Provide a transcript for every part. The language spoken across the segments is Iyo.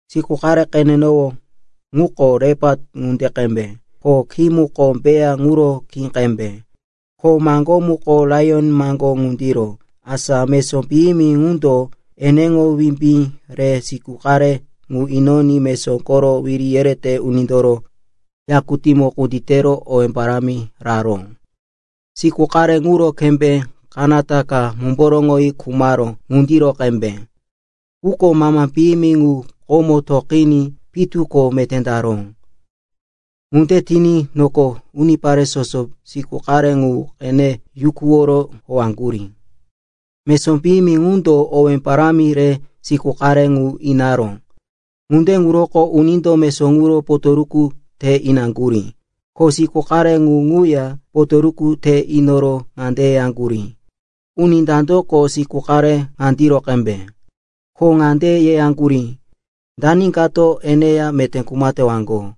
Siku qare qenenowó ŋuko lepat ŋunde qembe, ko khí muko bea ŋuro khí qembe, ko maŋgó muko laiyon maŋgó ŋundiro. Asa mesó piyimi ŋundo eneŋo wimbí re siku qare ŋu inoní mesó koro wiri yerete unindoro yakutímo kunditero owé parámi raró. Siku qare ŋuro kembé kanata ka mumboroŋoyi khumaró ŋundiro qembe. Quko mama piyimi ŋu komo toqiní pitu ko meté taró. Ŋunde tiní noko unipare soso siku qare ŋu qene yukuworo howaŋgurí. Mesó piyimi ŋundo owé parámi re siku qare ŋu inaró. Ŋunde ŋuroko unindo mesó ŋuro potoruku te inaŋgurí. Ko siku qare ŋu ŋuya potoruku te inoro ŋande yeyaŋgurí, “Uni dandoko siku qare ŋandiro qembe?” Ko ŋande yeyaŋgurí, “Dani kato eneya meté kuma tewaŋgo?”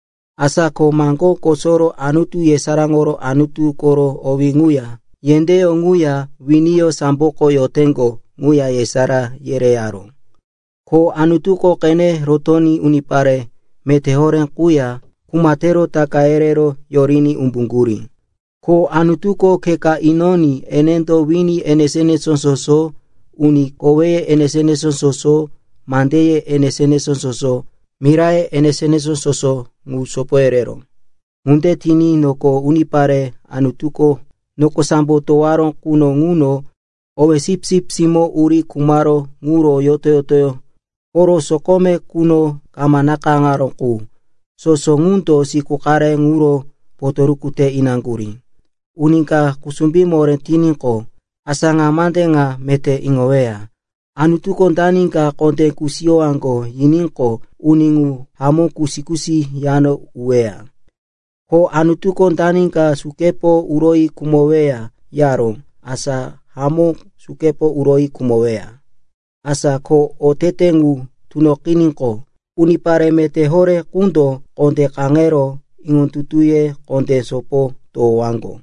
Asa ko maŋgó kosoro Anutu yesaráŋoro Anutu koro owí ŋuya yendéyó ŋuya winiyó samboko yoteŋgo ŋuya yesará yereyaró. Ko Anutuko qene rotoní unipare meté horé quya kuma tero taka yerero yoriní umbuŋgurí. Ko Anutuko khe ka inoní enendo wini enesó-enesó soso, uni koweye enesó-enesó soso, mandeye enesó-enesó soso, miraye enesó-enesó soso ŋu sopo yereró. Ŋunde tiní noko unipare Anutuko noko sambo towaró quno ŋuno owéye Sipsip Simó uri khumaró ŋuro yoto-yoto koro sokome quno kama nakayáŋaró qu, soso ŋundo siku qare ŋuro potoruku te inaŋgurí. Uni ka kusumbí moré tiníqo, asa ŋa mande ŋa meté iŋoweya. Anutuko dani ka kondé kusiyowaŋgo yiníqo uni ŋu hamó kusi-kusi yano uweya. Ko Anutuko dani ka sukepo uroyi khumoweya yaró, asa hamó sukepo uroyi khumoweya. Asa ko otete ŋu tunoqiníqo, unipare meté horé qundo kondé kaŋero iŋondutuye kondé sopo towowaŋgo.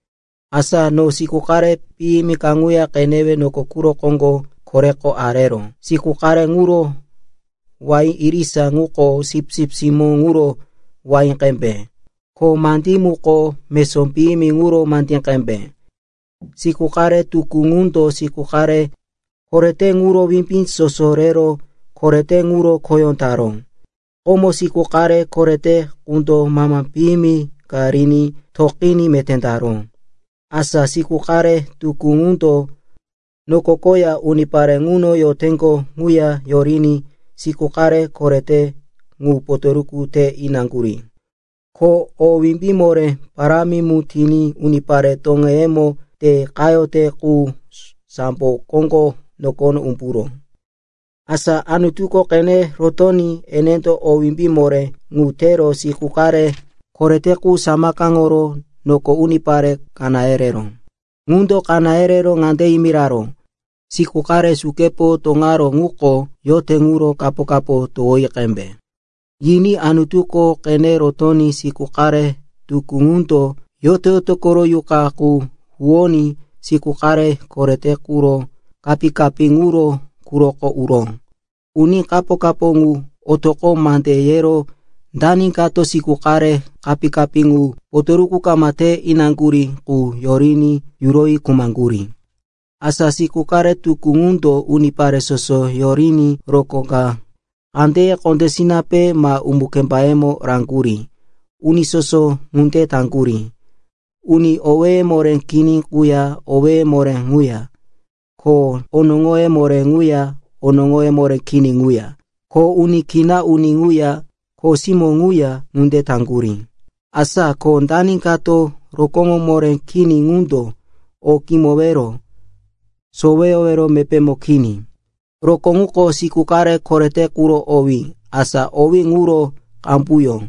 Asa no siku qare piyimi kaŋuya qenewe noko quro koŋgo koreko areró. Siku qare ŋuro wahí irisa ŋuko sipsip simó ŋuro wahí qembe, ko mandí muko mesó piyimi ŋuro mandí qembe. Siku qare tukú ŋundo siku qare korete ŋuro wimbí soso rero korete ŋuro khoyó taró. Komo siku qare korete qundo mama piyimi ka riní toqiní meté taró. Asa siku qare tukú ŋundo noko koya unipare ŋuno yoroteŋgo ŋuya yoriní siku qare korete ŋu potoruku te inaŋgurí. Ko o wimbí moré parámi mu tiní unipare toŋeyemo te qayote qu sambo koŋgo nokono umburó. Asa Anutuko qene rotoní enendo o wimbí moré ŋu tero siku qare korete qu samakaŋoro noko unipare kaná yereró. Ŋundo kaná yerero ŋande yimiraró, “Siku qare sukepo toŋaró quko yote ŋuro kapo-kapo ka towoyi qembe.” Yiní Anutuko qene rotoní siku qare tukú ŋundo yoto-yoto koro yuqa qu huwoní siku qare korete quro kapí-kapí ŋuro quroko uró. Uní kapo-kapo ŋu otoqo mande yero dani kato siku qare kapí-kapí ŋu potoruku kama te inaŋgurí qu yoriní yuroyi khumaŋgurí. Asa siku qare tukú ŋundo unipare soso yoriní rokó ka kandeye kondésinape ma umu-kembayemo raŋgurí. Uni soso ŋunde taŋgurí, uni owéye moré kini quya owéye moré ŋuya, ko onoŋoye moré quya onoŋoye moré kini ŋuya, ko uni kina uni ŋuya kho simó ŋuya ŋunde taŋgurí. Asa ko dani kato rokóŋo moré kini ŋundo o kimowero, soweyowero mepémo kini. Rokó ŋuko siku qare korete quro owí, asa owé ŋuro qambuyó.